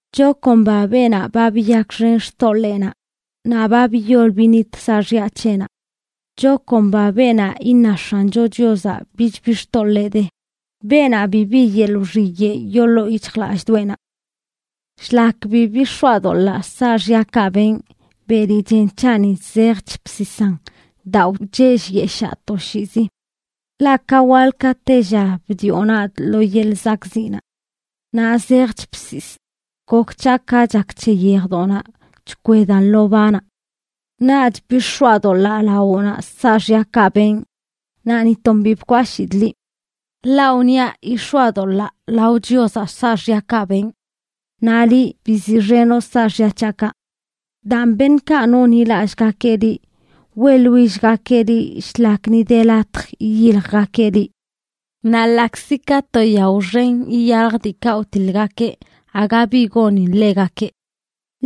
Chakomba beenaꞌ ba biyakxen xtoḻeenaꞌ, naꞌ ba biyol binit saaxya c̱heꞌnaꞌ. Chakomba beenaꞌ iṉa X̱ancho Chiozaꞌ bichbi xtoḻee de, beenaꞌ bibi yeḻꞌ wxiyeꞌ yoo ḻoo yic̱hjlallꞌdoꞌenaꞌ. Shlak bi bix̱oadoḻaa saaxyakaꞌ benꞌ, beli chen c̱haꞌni zejch bsisan daa wchellyeshaa toshiizi. Ḻaꞌ ka waḻ ka tella bdioꞌ nadꞌ lo yeḻꞌ zakꞌziꞌnaꞌ. Naꞌ zejch bsisꞌ, gok c̱haꞌ ka chak c̱he yejdoꞌnaꞌ chkwedan lo banaꞌ. Naꞌch bix̱oadoḻaa lawoꞌnaꞌ saaxyakaꞌ benꞌ, naꞌ ni ton bi bkwashidꞌ liꞌ. Ḻaꞌ wniaꞌ: “Yix̱oadolaa lao Chiozaꞌ saaxyakaꞌ benꞌ.” Naꞌ liꞌ, biziꞌxenoꞌ saaxya c̱haꞌkaꞌ. Daan, beṉꞌkaꞌ nonḻilallꞌgakeꞌ liꞌ, weꞌḻwillgakeꞌ liꞌ shlak ni de latj yiyiljgakeꞌ liꞌ; naꞌ ḻaꞌkzi ka to yao xen iyalj diikaꞌ wtiḻgakeꞌ aga bi gonin ḻegakeꞌ.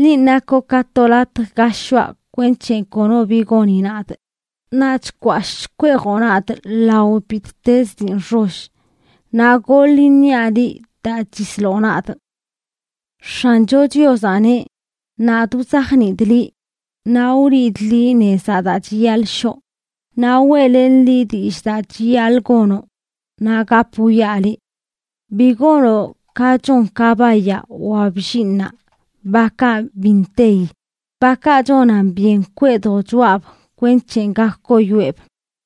Linꞌ nakoꞌ ka to latj ga shoꞌa kwenc̱he kono bi goni nadꞌ; naꞌ chkwashꞌ chkweejoꞌ nadꞌ lao bittezə dii nxoll, naꞌ goḻ iṉiaꞌ liꞌ daa chisloꞌ nadꞌ. X̱ancho Chiozaꞌ neꞌ: “Nadꞌ wzajniidꞌ liꞌ, naꞌ wliidꞌ liꞌ nezaꞌ daa chiyaḻꞌ shoꞌ; naꞌ weꞌlenꞌ liꞌ dillꞌ daa chiyaḻꞌ gonoꞌ, naꞌ gap wwiaꞌ liꞌ. Bi gonoꞌ ka chon kabayaꞌ wa bllinꞌnaꞌ, bakaꞌ bi nteyi; bakaꞌ chonan byen kwee dochoꞌab kwenc̱he gak koyoeꞌb.”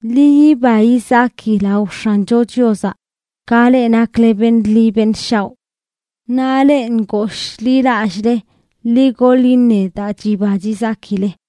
Ḻi yiba yizaki lao X̱ancho Chiozaꞌ ka leꞌ nakle beṉꞌ ḻi beṉꞌ shaoꞌ. Naꞌ leꞌ ngooshḻilallꞌle, ḻi goḻ iṉe daa chiba chizakile.